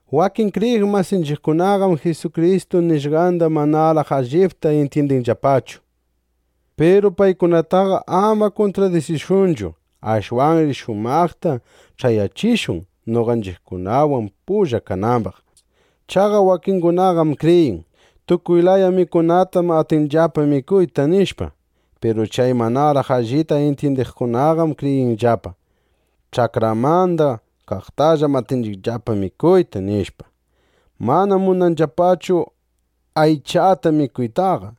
Wakin kriyiq masinchiqkunaqam Jisukristu nishqandaqa manaraq allitaqa intyindinllapachu. Piru paykunataqa ama kuntradisishunchu. Ashwanri shumaqta ch'ayachishun, noqanchiqkunawan pulla kanambaq. Chaqa wakingunaqam kriyin: Tukuy laya mikunatam atinchiqllapa mikuyta, nishpa. Piru chay manaraq allita intyindiqkunaqam kriyinllapa: Ch'akramanda kaqtallam atinchiqllapa mikuyta, nishpa. Manam munanllapachu aychata mikuytaqa.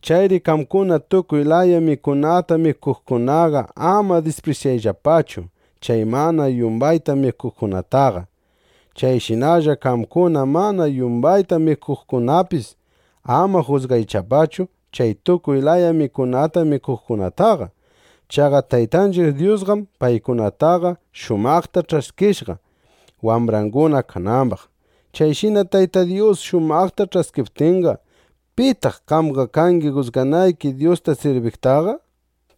Chayri qamkuna tukuy laya mikunata mikuqkunaqa ama disprisyayllapachu chay mana yumbayta mikuqkunataqa. Chayshinalla qamkuna mana yumbayta mikuqkunapis ama jusgayllapachu chay tukuy laya mikunata mikuqkunataqa. Chaqa Taytanchiq Dyusqam paykunataqa shumaqta ch'askishqa, wambranguna kanambaq. Chayshina Tayta Dyus shumaqta ch'askiptinqa, ¿pitaq qamqa kangi jusganayki Dyusta sirbiqtaqa?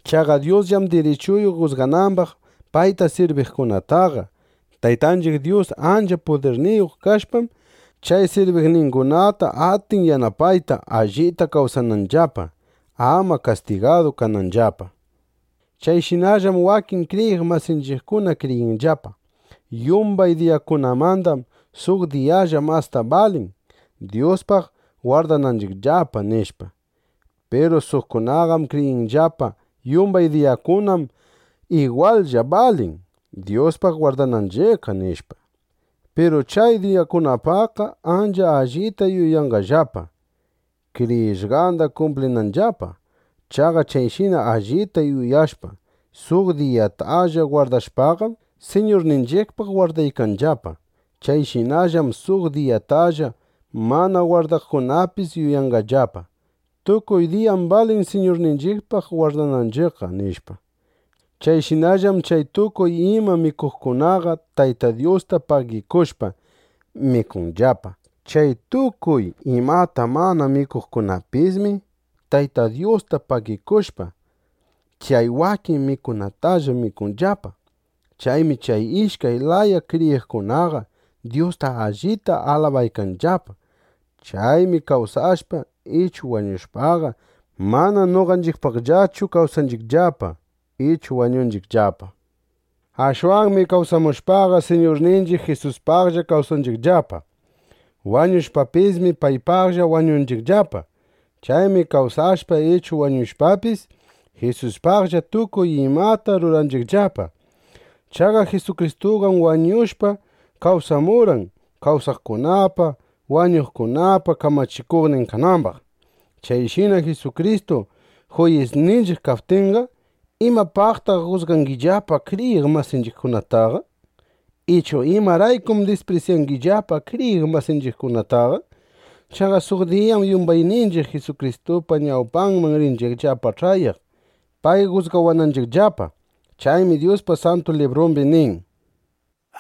Chaqa Dyusllam dirichuyuq, jusganambaq payta sirbiqkunataqa. Taytanchiq Dyus ancha pudirniyuq kashpam, chay sirbiqningunata atin yanapayta, allita kawsananllapa, ama kastigadu kananllapa. Chayshinallam wakin kriyiq masinchiqkuna kriyinllapa: Yumbay diyakunamandam suq diyalla masta balin, Dyuspaq gwardananchiqllapa, nishpa. Piru suqkunaqam kriyinllapa: Yumbay diyakunam igwallla balin, Dyuspaq gwardananchiqqa, nishpa. Piru chay diyakunapaqqa ancha allita yuyanqallapa, kriyishqanda kumplinanllapa. Chaqa chayshina allita yuyashpa, suq diyatalla gwardashpaqam, Siñurninchiqpaq gwardaykanllapa. Chayshinallam suq diyatalla mana gwardaqkunapis yuyanllapa: Tukuy diyam balin Siñurninchiqpaq gwardananchiqqa, nishpa. Chayshinallam chay tukuy imata mikuqkunaqa Tayta Dyusta pagikushpa, mikunllapa. Chay tukuy imata mana mikuqkunapismi Tayta Dyusta pagikushpa, chay wakin mikunatalla mikunllapa. Chaymi chay ishkay laya kriyiqkunaqa Dyusta allita alabaykanllapa. Chaymi kawsashpa ichu wañushpaqa, mana noqanchiqpaqllachu kawsanchiqllapa ichu wañunchiqllapa. Ashwanmi kawsashpaqa, Siñurninchiq Jisuspaqlla kawsanchiqllapa. Wañushpapismi, paypaqlla wañunchiqllapa. Chaymi kawsashpa ichu wañushpapis, Jisuspaqlla tukuy imata ruranchiqllapa. Chaqa Jisukristuqam wañushpa kawsamurqan, kawsaqkunapa, wañuqkunapa kamachikuqnin kanambaq. Chayshina Jisukristu juyisninchiq kaptinqa, ¿imapaqtaq jusgangillapa kriyiq masinchiqkunataqa? Ichu ¿imaraykum disprisyangillapa kriyiq masinchiqkunataqa? Chaqa suq diyam yumbayninchiq Jisukristupa ñawpanman rinchiqllapa ch'ayaq, pay jusgawananchiqllapa. Chaymi Dyuspa Santu Librumbi nin: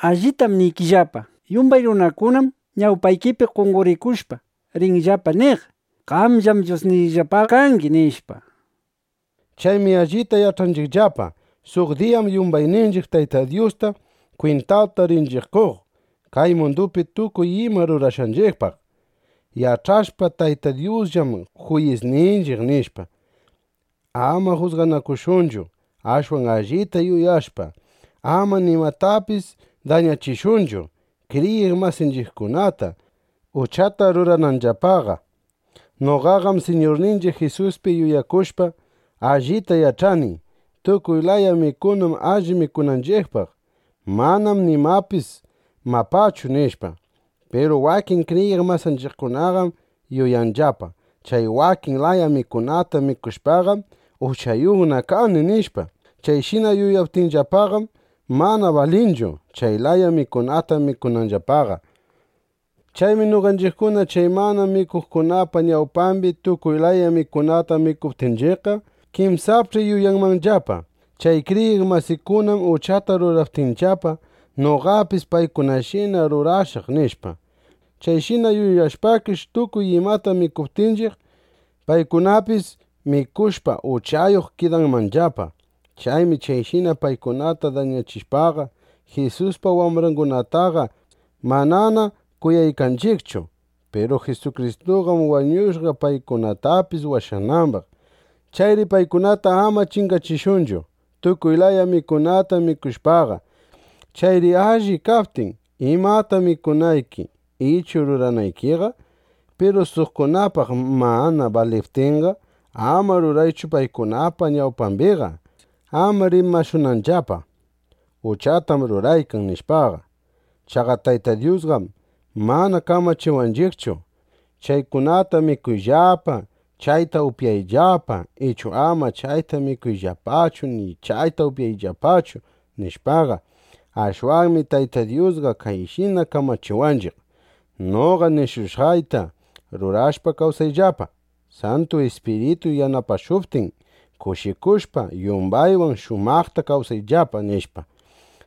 Alliptam niykillapa, yumbay runakunam ñawpaypi qonqorikushpa, rinllapa niq: “Qamllam Dyusniyllapa kangi”, nishpa. Chaymi allita yach'anchiqllapa: Suq diyam yumbayninchiq Tayta Dyusta kwintata rinchiq qoq, kay mundupi tukuy ima rurashqanchiqpaq. Yach'ashpa: Tayta Dyusllam juyisninchiq, nishpa, ama jusganakushunchu. Ashwan allita yuyashpa, ama nimatapis dañachishunchu kriyiq masinchiqkunata, uchata rurananllapaqa. Noqaqam Siñurninchiq Jisuspi yuyakushpa, allita yach'ani: Tukuy laya mikunam alli mikunanchiqpaq. Manam nimapis mapachu, nishpa. Piru wakin kriyiq masinchiqkunaqam yuyanllapa: Chay wakin laya mikunata mikushpaqam, uchayuqna kani, nishpa. Chayshina yuyaptinllapaqam, mana balinchu, chay laya mikunata mikunanllapaqa. Chaymi noqanchiqkuna chay mana mikuqkunapa ñawpambi tukuy laya mikunata mikuptinchiqqa, kinsapch'i yuyanmanllapa: Chay kriyiq masiykunam uchata ruraptinllapa, noqapis paykunashina rurashaq, nishpa. Chayshina yuyashpakish, tukuy imata mikuptinchiq, paykunapis mikushpa, uchayuq kidanmanllapa. Chaymi chayshina paykunata dañachishpaqa, Jisuspa wambrangunataqa manana kuyaykanchiqchu. Piru Jisukristuqam wañushqa, paykunatapis washanambaq. Chayri paykunata ama chingachishunchu, tukuy laya mikunata mikushpaqa. Chayri alli kaptin imata mikunayki ichu ruranaykiqa, piru suqkunapaq mana baliptinqa, ama ruraychu paykunapa ñawpambiqa, ama rimashunanllapa: “Uchatam ruraykan”, nishpaqa. Chaqa Tayta Dyusqam mana kamachiwanchiqchu: “Chaykunata mikuyllapa, chayta upyayllapa, ichu ama chayta mikuyllapachu ni chayta upyayllapachu”, nishpaqa. Ashwanmi Tayta Dyusqa kayshina kamachiwanchiq: Noqa nishushqayta rurashpa kawsayllapa. Santu Ispirituy yanapashuptin, kushikushpa, yumbaywan shumaqta kawsayllapa, nishpa.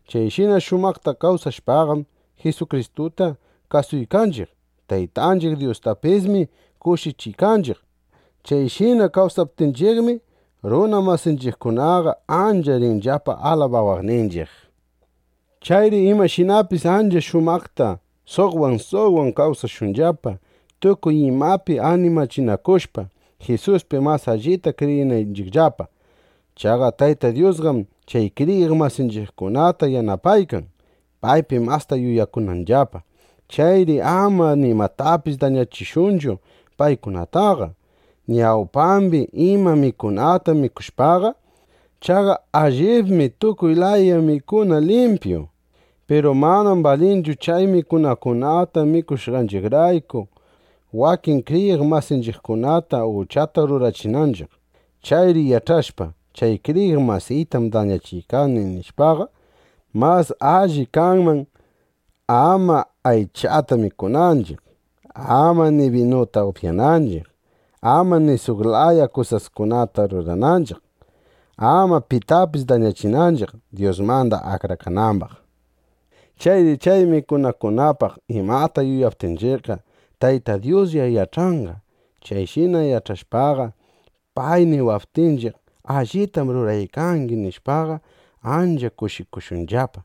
Chayshina shumaqta kawsashpaqam, Jisukristuta kasuykanchiq. Taytanchiq Dyustapismi kushichiykanchiq. Chayshina kawsaptinchiqmi, runa masinchiqkunaqa ancha rinllapa alabawaqninchiq. Chayri imashinapis ancha shumaqta suqwan suqwan kawsashunllapa, tukuy imapi animachinakushpa, Jisuspi mas allita kriyinanchiqllapa. Chaqa Tayta Dyusqam chay kriyiq masinchiqkunata yanapaykan, paypi masta yuyakunanllapa. Chayri ama nimatapis dañachishunchu paykunataqa, ñawpambi ima mikunata mikushpaqa. Chaqa allibmi tukuy laya mikuna limpyu. Piru manam balinchu chay mikunakunata mikushqanchiqrayku, wakin kriyiq masinchiqkunata uchata rurachinanchiq. Chayri yach'ashpa: Chay kriyiq masiytam dañachiykani, nishpaqa, mas alli kanman ama aychata mikunanchiq, ama ni binuta upyanchiq, ama ni suq laya kusaskunata rurananchiq, ama pitapis dañachinanchiq, Dyusmanda akrakanambaq. Chayri chay mikunakunapaq imata yuyaptinchiqqa, Tayta Dyuslla yach'anqa. Chayshina yach'ashpaqa, pay niwaptinchiq: Allitam ruraykangi, nishpaqa, ancha kushikushunllapa.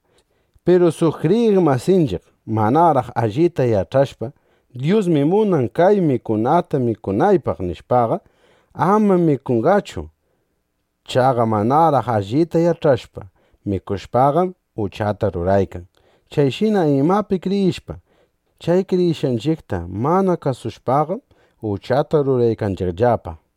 Piru suq kriyiq masinchiq manaraq allita yach'ashpa: Dyusmi munan kay mikunata mikunaypaq, nishpaqa, ama mikunqachu. Chaqa manaraq allita yach'ashpa mikushpaqam, uchata ruraykan. Chayshina imapi kriyishpa, chay kriyishqanchiqta mana kasushpaqam, uchata ruraykanchiqllapa.